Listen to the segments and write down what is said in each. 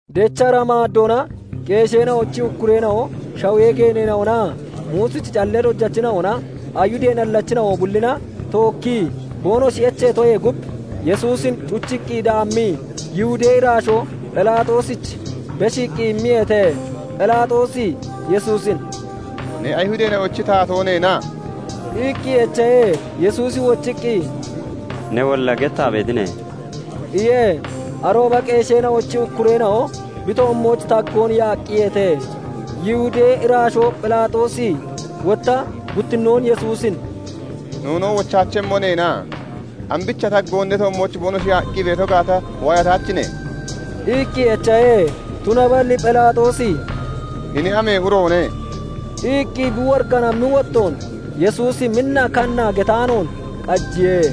Dechra maaddoona qeesheena'ochi ukkureena'o, shawee geeneena'onaa Muusichi callee dojachina'ona, Ayihudee nallachina'o bullina tookkii boonoshi echeetoyee gub, Yesuusin cuchiiqqi daammii Yihudee iraashoo Phelaaxoosich beshiiqqi immiyeete. Phelaaxoosi Yesuusin "Ne Ayihudeena'ochi taatoo neena?" iqqi echahe. Yesuusi wochiqqi, "Newolla gettaa beetine" iye. Arooba qeesheena'ochi ukkureena'o bi toommooch tagoon yaaqqiyeete. Yihudee iraashoo Phelaaxoosi wotta guttinnoon Yesuusin "Noonoo wochaachemmo neena? Ambicha taggoon ne toommooch boonoshi yaaqqi beeto gaata waayataachine?" iqqi echahe. Tunaballi Phelaaxoosi "Hini amee uroone?" iqqi bi woriganammi wottoon Yesuusi minna kanna getaanoon qajiye.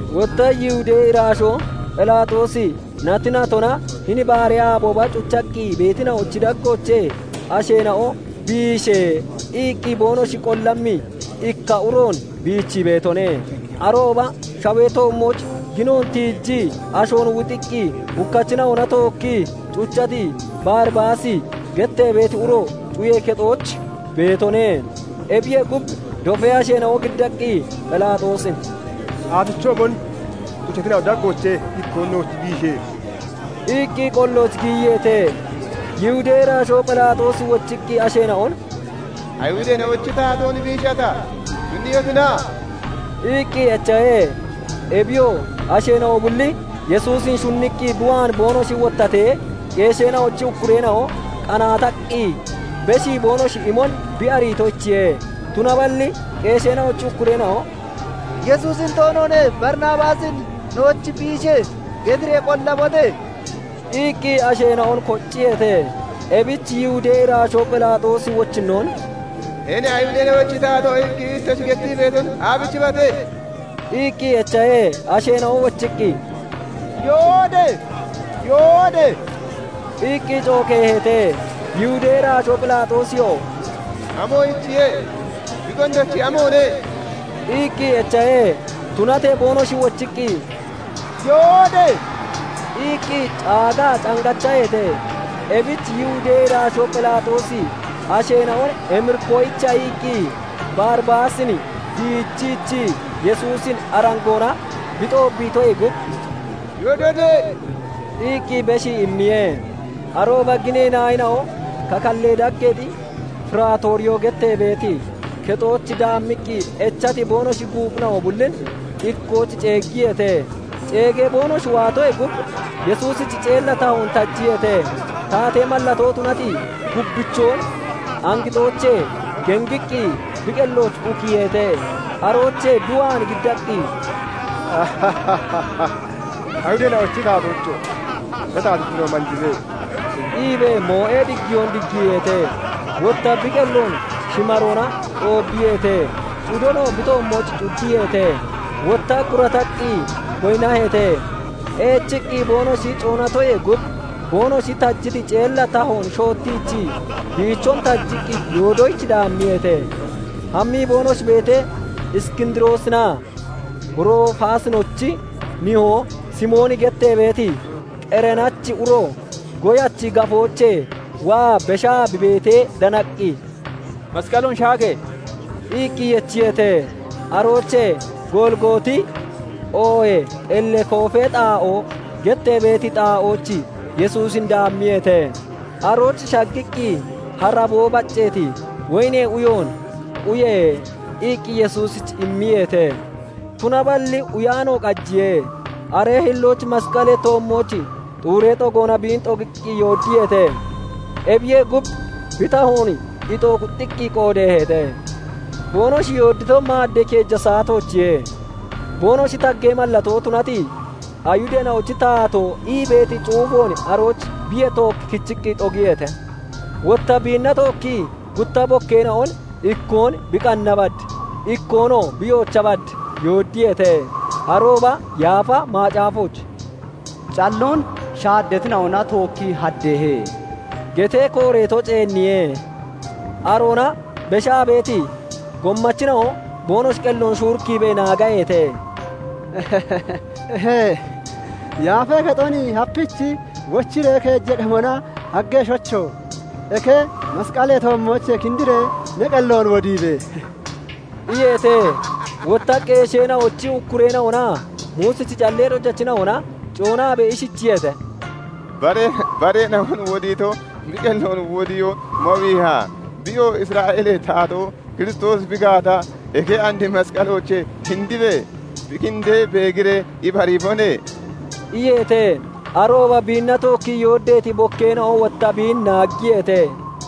Wotta Yihudee iraashoo Phelaaxoosi nati natona hini baaree aabooba cuchaqqi beetina'ochi daggoochee asheena'o "Biishe!" iqqi boonoshi qollammi ikka uroon bichii beetone. Arooba shawee toommooch gino tiijii ashoon wuxiqqi hukkachina'ona tookkii cuchati Baribaasi gettee beeti uro cuyee kexooch beetone. Ebiyee gub, dofee asheena'o giddaqqi Phelaaxoosin "Aafichoomon cucheetina'ochi daggoochee ikkoon nooch biishe!" iqqi qollooch giyiyeete. Yihudee iraashoo Phelaaxoosi wochiqqi asheena'on "Ayihudeena'ochi taatoon biishata? Shunniyotina?" iqqi echahe. Ebiyoo asheena'o bulli Yesuusin shunniqqi bi waan boonoshi wottatee, qeesheena'ochi ukkureena'o qanaataqqi beshii boonoshi imon bi ariitoyichiye. Tunaballi qeesheena'ochi ukkureena'o " 'Yesuusin toonoone; Baribaasin nooch biishe!" getiree qollabote!" iqqi asheena'on kocciyeete. Ebich Yihudee iraashoo Phelaaxoosi wochinnoon "Hini 'Ayihudeena'ochi taatoo' iqqi ittoshi gettii beeton aabichibate?" iqqi echahe. Asheena'o wochiqqi, "Yoode!" iqqi cookeeheete. Yihudee iraashoo Phelaaxoosiyoo, "Amoyichiye? Bi gondochi amoone?" iqqi echahe. Tunatee boonoshi wochiqqi, "Yoode!" iqqi caagaa cangachaheete. Ebich Yihudee iraashoo Phelaaxoosi asheena'on emirikkoyicha iqqi Baribaasin biichiichii Yesuusin arangoona bi xoobbiitoyee gub, "Yoodote!" iqqi beshii immiye. Arooba ginee naayina'o kakallee dageexi firaatoriyoo gettee beeti kexooch daammiqqi echati boonoshi guuphina'o bullin ikkooch ceeggiyeete. Ceegee boonoshi waatoyee gub Yesuusich ceella tahoon tajiyeete; taatee mallatoon tunati gubbichoon angixoochee gengiqqinoo bi qellooch ukiiheete. Aroochee bi waan giddaqqi, "Ayihudeena'ochi taatoocho! Ne taatittino manjibe" iibee moo'ee diggiyoon diggiiheete. Wotta bi qelloon shimaroona xoobbiyeete; cudonoo bi toommooch cuddiyeete; wotta gurataqqi goyinnaheete. Eechiqqi boonoshi coonatoyee gub, boonoshi tajiti ceella tahoon shottiichii, biichon tajiqqi yoodoyich daammiyeete. Hammii boonoshi beetee, Iskindiroosinaa Rofaasinochi nihoo Simooni gettee beeti Qereenachi uro goyachi gafoochee waa beshaa bi beetee danaqqi, "Masqaloon shaage!" iqqi yechiyeete. Aroochee "Golgooti" oohee "Qellee koofee xaa'oo" gettee beeti xaa'ooch Yesuusin daammiyeete. Arooch shaggiiqqi haraboo bacceeti woyinee uyoon "Uye!" iqqi Yesuusich immiyeete; tunaballi uyaano qajiye. Aree hillooch masqalee toommooch xuuree xogoona biin xogiqqi yooddiyeete. Ebiyee gub, bi tahoon ixoo kuxxiqqi qoodeeheete. Boonoshi yooddito maaddee keeja saatoochiye. Boonoshi taggee mallatoo tunati "Ayihudeena'ochi taatoo" ii beeti cuufoon arooch biyee took kichiqqi xogiyeete. Wotta biinna tookkii gutta bokkeena'on ikkoon bi qanna bad, ikkoonoo bi yoocha bad yooddiyeete. [Arooba Yaafa Macaafooch "Calloon shaaddatina'ona tookkii haddeehe" getee kooreeto ceenniye.] Aroona beshaa beeti gommachina'o boonoshi qelloon shuurikkiibee naagaheete; "Eeh! Yaafee Kexon hapiichi wochiree keeja qemona haggeshocho! Eke masqalee toommoochee kindiree ne qelloon wodibe!" iyeete. Wotta qeesheena'ochi ukkureena'onaa Muusichi callee dojachina'ona coonaabee ishichiyeete:- "Bareena'on wodiito bi qelloon wodiyoo mawiiha? Biyoo Isra'eelee taatoo Kiristoosi bi gaata, eke and masqaloochee kindibe. Bi kindee beegiree ibariibone" iyeete. Arooba biinna tookkii yooddeeti bokkeena'o wotta biin naaggiyeete.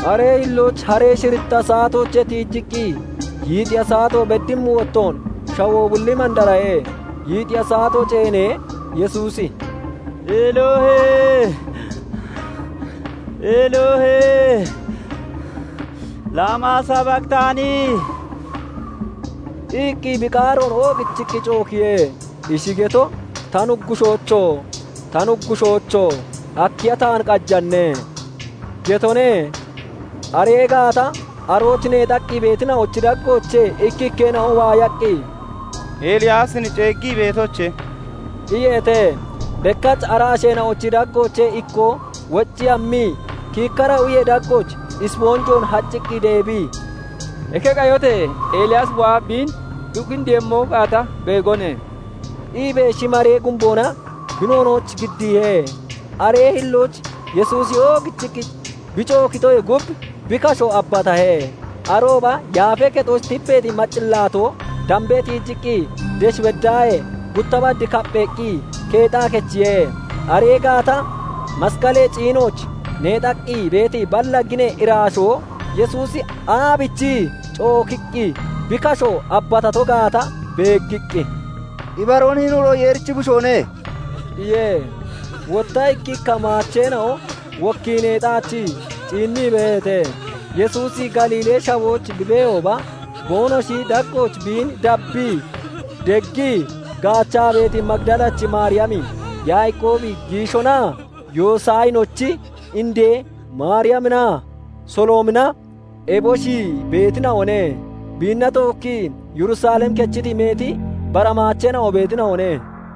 Aree hillooch haree shiritta saatoochee tiijiqqi yiixiya saato beddimmi wottoon shawoo bulli mandarahe. Yiixiya saato ceenee, Yesuusi "Eloohe! Eloohe! Laamaa sabaqitaani?" iqqi bi qaaroon oogichiqqi cookiye. Ishi geto "Ta Nuggushoocho! Ta Nuggushoocho! Akkiya taan qajane?" getone. Aree gaata arooch neexaqqi beetina'ochi daggoochee ikkikkeena'o waayaqqi, "Eliyaasin ceeggii beetoche!" iyeete. Bekkach ara asheena'ochi daggoochee ikkoo woccii hammii, kiikkara uyee daggooch isponjoon hacciqqi deebii, "Eke qayotee Eliyaasi waa biin bi kindiiyemmo gaata beegone" iibee shimaree gumboona bi noonooch giddiihe. Aree hillooch Yesuusi oogichiqqi bi cookitoyee gub, bi kasho abbatahe. Arooba Yaafee Kexooch tipeeti maccillaatoo dambee tiijiqqi desh beddaahee gutta bad kappheeqqi keexaa kechiye. Aree gaata masqalee ciinooch neexaqqi beeti balla ginee iraashoo Yesuusi aabichii [cookiqqi] bi kasho abatato gaata beeggiqqi, "Ibaroon hini uro Yeerichi Bushoone" iye. Wotta ikkikka maacheena'o wokkii neexaachii ciinnii beeheete. Yesuusi Galiilee shawooch bi beehooba boonoshi daggooch biin dabbii deggii gaachaa beeti Magidalachi Maariyami, Yaaqoobi giishonaa Yoosayinochi indee Maariyaminaa Soloomina eboshi beetina'one. Biinna tookkii Yerusalem kechiti meeti bara maacheena'o beetina'one.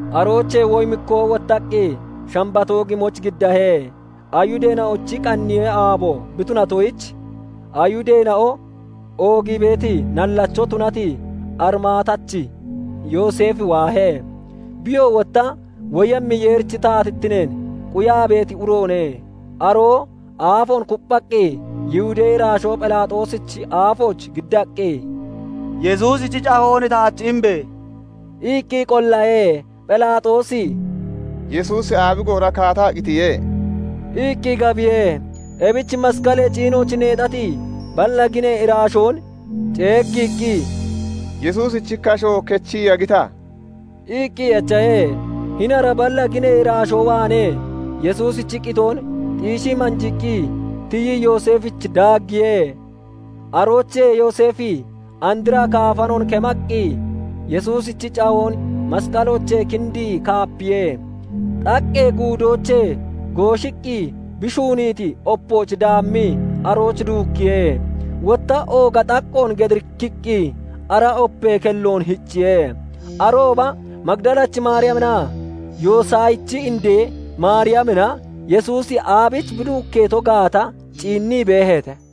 Aroochee woyimikkoo wottaqqi Shambatoo gimooch giddahe. Ayihudeena'ochi qaniyee aabo bi tunatoyich, Ayihudeena'o oogii beeti nallacho tunati Arimaatachi Yooseefi waahe. Biyoo wotta woyemmi Yeerichi taatittineen quyaa beeti uroone. Aroo aafoon kupphaqqi Yihudee iraashoo Phelaaxoosichi aafooch giddaqqi, "Yesuusichi cahoon taach imbe!" iqqi qollahe. Phelaaxoosi "Yesuusi aabi goora kaataa qitiye?" iqqi gabiye. Ebich masqalee ciinooch neexati balla ginee iraashoon ceeggiiqqi, "Yesuusichi kasho kechii yagita?" iqqi echahe. Hini ara balla ginee iraashoo waanee Yesuusichi qitoon xiishii manjiiqqi tiyii Yooseefich daaggiye. Aroochee Yooseefi andra kaafanoon kemaaqqi, Yesuusichi cahoon masqaloochee kindii kaapiye. Xaqqee guudoochee gooshiiqqi bi shuuniiti opooch daammii arooch duukkiye. Wotta ooga xaqqoon gedirikiqqi ara opee kelloon hicciye. Arooba Magidalachi Maariyaminaa Yoosayichi indee Maariyamina Yesuusi aabiich bi duukkeeto gaata ciinnii beeheete.